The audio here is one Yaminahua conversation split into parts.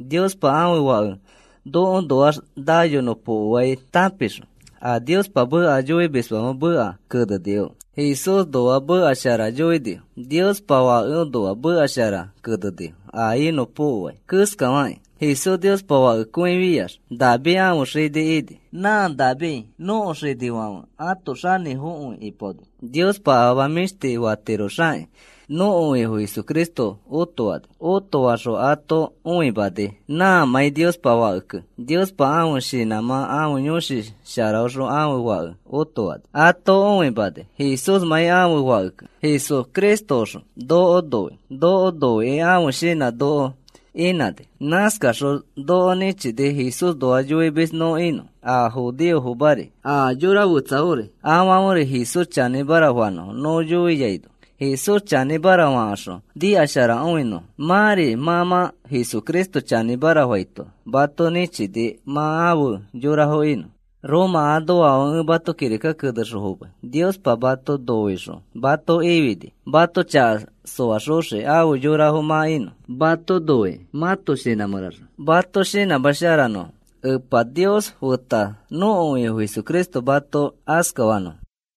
Niospa ãfe Fake nokoõnoax naiyonõpokoai tãpixõ a Niospa meka yoimisfãfe meka kenenifo. Jesúsnoa meka shara yoinifo. Niospa Fakeõnoa meka shara kenenifo a inõpokoai keskafakĩ. Jesús Niospa Fakekõifiax David ãfe xini ini. Nã David nõko xinifãfe ãto xanĩfokõi ipaoni. Niospa afama mĩshti fatiroxakĩ nõko Ifo Jesucristo otofani. Otofaxõ ato õimani nãmãi Niospa Fakekẽ. Niospa ãfe shinãmã ãfe Yõshi Sharaõxõ ãfe Fake otofani. Ato õimani Jesúsmãi ãfe Fakekẽ. Jesucristoxõ noko noi. Noko noikĩ ãfe shinã noko inãni. Nãskaxõ noko nĩchini Jesúsnoa yoimis nõ inõ. A judeofomari a xoko fetsafori afãferi Jesús chanĩmara fanõfo nõ yoiaino. Jesús chanĩmara fakaxõ nikasharakõinõfo. Mãri mã mã Jesucristo chanĩmara faito mato nĩchini mã afe yorafo inõ. Roma anoafãfe, ẽ mato kirika kenexõ fomai. Niospa mato noixõ mato ifini mato chaka soaxoxiki afe yorafo mã inõ. Mato noikĩ mãto shinã mẽraxõ mato shinãsharamanõ. Epa Nios feta nõko Ifo Jesucristo mato askafanõ.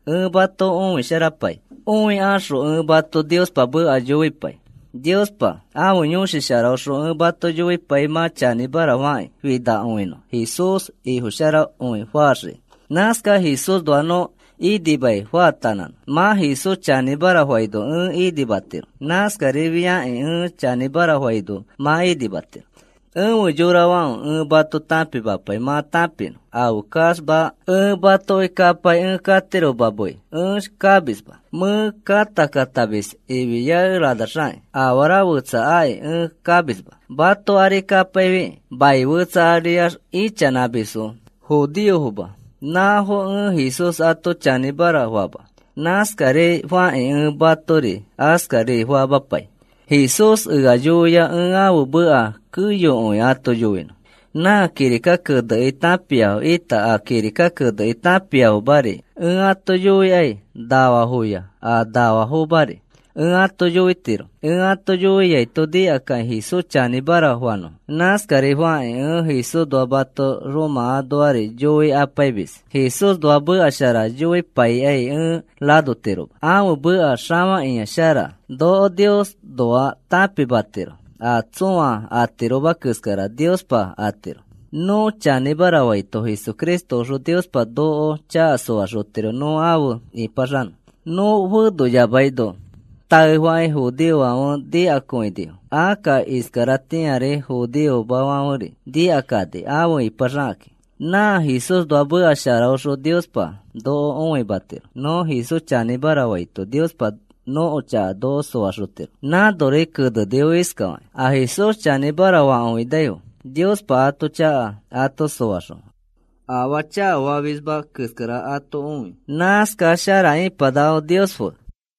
Ẽ mato õisharapai. Õikaxõ ẽ mato Niospa meka yoipai. Niospa ãfe Yõshi Sharaõxõ ẽ mato yoipai mã chanĩmara fakĩ finakõinõ Jesús Ifo sharakõi faxiki. Nãskax Jesúsnoax nõ inima faatanãnõ. Mã Jesús chanĩmara faino ẽ inimatiro. Nãskarifiakĩ ẽ chanĩmara faino mã inimatiro. Efe yorafãfe, ẽ mato tãpimapai mã tãpinõ afeskaxma ẽ matoki kapai ẽ katiroma mei, ẽ kamisma. Mẽ kãta katamis ifiakeranax afara fetsa aki ẽ kamisma, mato ari kapaifi. Mai fetsa aria ichanãmisfo judeofoma nãfo ẽ Jesús ato chanĩmara fama. Nãskari fakĩ ẽ matori askari famapai. Jesús ea yoia ẽ ãfe meka keyokõi ato yoinõ. Nã kirika kenekĩ tãpiafo ita a kirika kenekĩ tãpiamafori ẽ ato yoikai. Nafafoya a nafamafori ẽ ato yoitiro. Ẽ ato yoiaito nikakakĩ Jesús chanĩmara fanõfo. Nãskari fakĩ ẽ Jesúsnoa mato Roma anoari yoikapaimis. Jesúsnoa meka shara yoipaikai ẽ ranotiroma. Ãfe meka xafakĩa shara. Noko Niosnoa tãpimatiro a tsõa atiroma keskara Niospa atiro. Nõ chanĩmara faito Jesucristoxõ Niospa noko chaka soaxotiro nõ afe ĩpaxanõ, nõ fenoyamaino. Taefakĩ judeofãfe nikakõinifo. Akka iskaratĩari judeofomafãferi nikakani afe ipaxakakĩ. Nã Jesúsnoa meka sharaõxõ Niospa noko õimatiro. Nõ Jesús chanĩmara faito Niospa nõko chaka noko soaxotiro. Nãnori kenenifo iskafakakĩ: “A Jesús chanĩmara fakõinaifo Niospa ãto chaka ato soaxõ afaa chakafamisma keskara ato õi. Nãskax shara ipanakafo Nios fe.”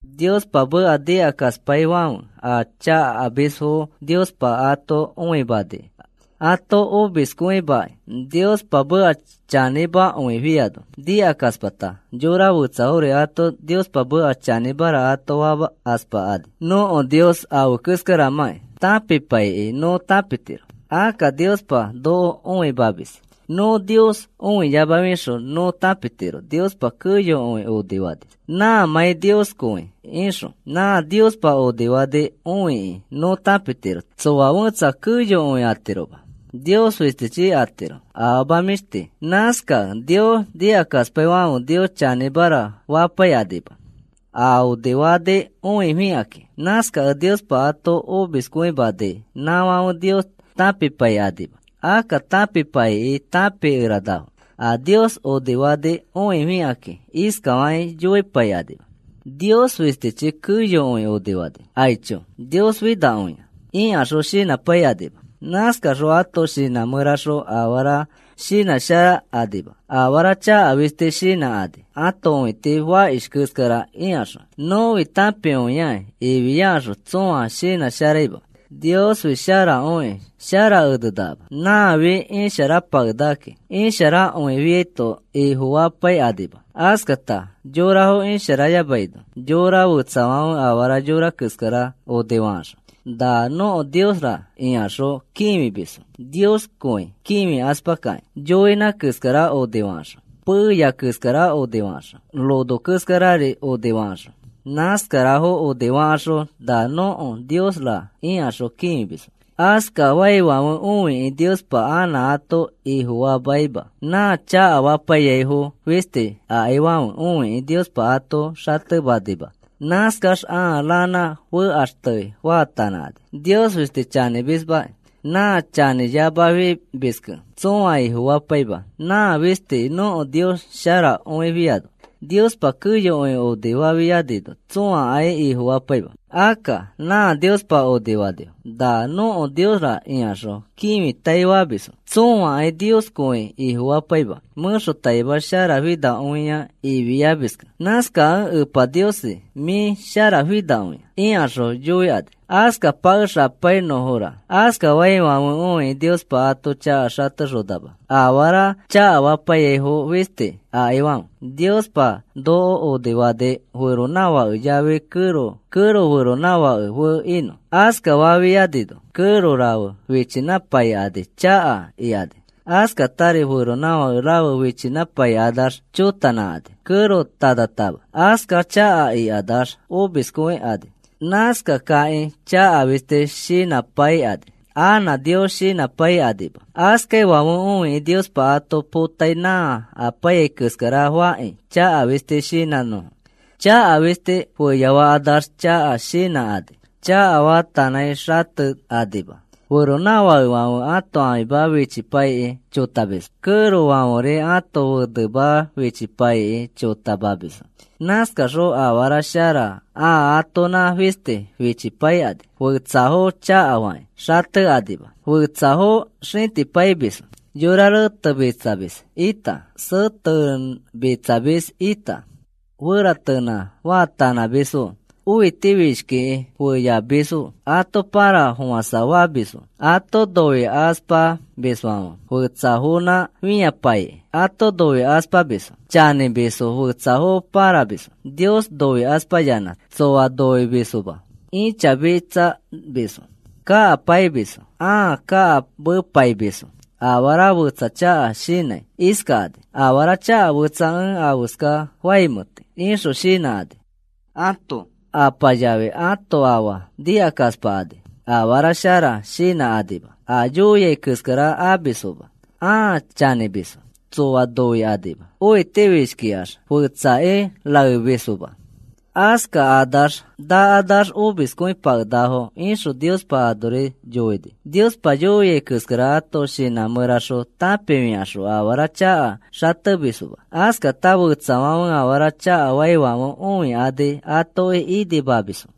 Niospa meka nikakaspaifãfe a chakafamisfo Niospa ato õimani ato omiskõimakĩ. Niospa meka chanĩmakõifiano nikakaspakata yora fetsafori ato Niospa meka chanĩmara ato famakaspakani. Nõko Nios afe keskaramãkĩ tãpipaikĩ nõ tãpitiro. Akka Niospa noko õimamis. Nõ Nios õiyamafixõ nõ tãpitiro Niospa keyokõi onifani, nãmãi Nioskõi ixõ. Nã Niospa onifani õikĩ nõ tãpitiro tsoa fẽtsa keyokõi atiroma. Nios fistichi atiro, afama mĩshti. Nãskakẽ Nios nikakaspaifãfe Nios chanĩmara fapaikanima, a onifani õifikakĩ. Nãskakẽ Niospa ato omiskõimani nãfãfe Nios tãpipaikanima. Akka tãpipaikĩ tãpikeranafo. A Niospa onifani õifikakĩ iskafakĩ yoipaikanima: “Nios fistichi keyokõi onifani. Aicho, Nios finakõia,” ikaxõ shinãpaikanima. Nãskakaxõ ãto shinã mẽraxõ afara shinãsharakanima. Afara chaka fisti shinãkani ãto õiti fakish keskara ikaxõ. “Nõfi tãpikõiaki,” ifiakaxõ tsõa shinãsharaima. Niosfi sharakõikĩ shara enenakama. Nãfi isharapakenakakĩ. Isharakõifiaito Ifofapaikanima. Askata yorafo isharayamaino yora fetsafãfe afara yora keskara onifakaxõ, “Na nõko Niosra,” ikaxõ kĩfimisfo Nioskõi kĩfikaspakakĩ. Yoinã keskara onifakaxõ, peya keskara onifakaxõ, rono keskarari onifakaxõ, nãskarafo onifakaxõ, “Na nõko Niosra,” ikaxõ kĩfimisfo. Askafaifãfe õikĩ Niospa anã ato Ifofamaima. Nã chakafapaiyaifo fisti akaifãfe õikĩ Niospa ato xatemanima. Nãskax ãa ranã fekaxte faatanãkani. Nios fistifi chanĩmismaki. Nã chanĩyamafimiskẽ tsõa Ifofapaima nã fisti nõko Nios sharakõifiano. Niospa keyokõi onifafianino tsõakai Ifofapaima. Akka nã Niospa onifanifo, “Nã nõko niosra,” ikaxõ kĩfitaifamisfo. Tsõakai Nioskõi Ifofapaima, mẽxotaima sharafinakõia ifiamiskẽ. Nãskakẽ, “Epa Niosi, mĩ sharafinakõia,” ikaxõ yoikani. Askapakexapainõfora. Askafaifãfe õikĩ Niospa ato chaka xatexonama, afara chakafapaiyaifo fisti akaifãfe. Niospa noko onifani feronãfake yafi kẽro, kẽro feronãfake fe inõ. Askafafianino kẽro rafe fichinãpaikani chaka ikani. Askatari feronãfake rafe fichinãpaikanax chotanãkani, kẽro tanatama. Askax chaka ikanax omiskõikani. Nãskakakĩ chaka fisti shinãpaikani. Anã Nios shinãpaikanima. Askaifãfe õikĩ Niospa ato potai nã apaiyai keskara fakĩ chaka fisti shinãnõfo. Chaka fisti feyafakanax chaka shinãkani. Chaka faatanãi xatekanima. Feronãfakefãfe ãto ãfima fichipaikĩ chotamisfo. Kẽrofãferi ãto fenema fichipaikĩ chotamamisfo. Nãskaxõ afara shara ãa atonã fisti fipaikani. Fetsafo chakafakĩ xatekanima. Fetsafo xĩtipaimisfo. Yora retemitsamis ita, setemitsamis ita, feratenã faatanãmisfo. Õitifishkikĩ feyafamisfo. Ato pãrafofãsafamisfo. Ato noikaspamisfãfe fetsafonã fĩapaikakĩ. Ato noikaspamisfo. Chanĩmisfo fetsafo pãramisfo. Nios noikaspayanã tsoa noimisfoma. Ĩchamitsamisfo. Kakapaimisfo, ãa kakamepaimisfo. Afara fetsa chaka shinãi iskakani: “Afaa chaka fetsa ẽ afeska faimẽti,” ixõ shinãkani. Ãto apa yafi ãto afa nikakaspakani. Afara shara shinãkanima. A yoiai keskara amisfoma. Ãa chanĩmisfo. Tsoa noikanima. Õitifishkikax fetsaki raemisfoma. “Askakanax nakanax omiskõipakenakafo,” ixõ Niospa anori yoini. Niospa yoia keskara ãto shinã mẽraxõ tãpifikaxõ afara chaka xatemisfoma. Askata fetsafãfe afara chakafaifãfe õikani atoki inimamisfo.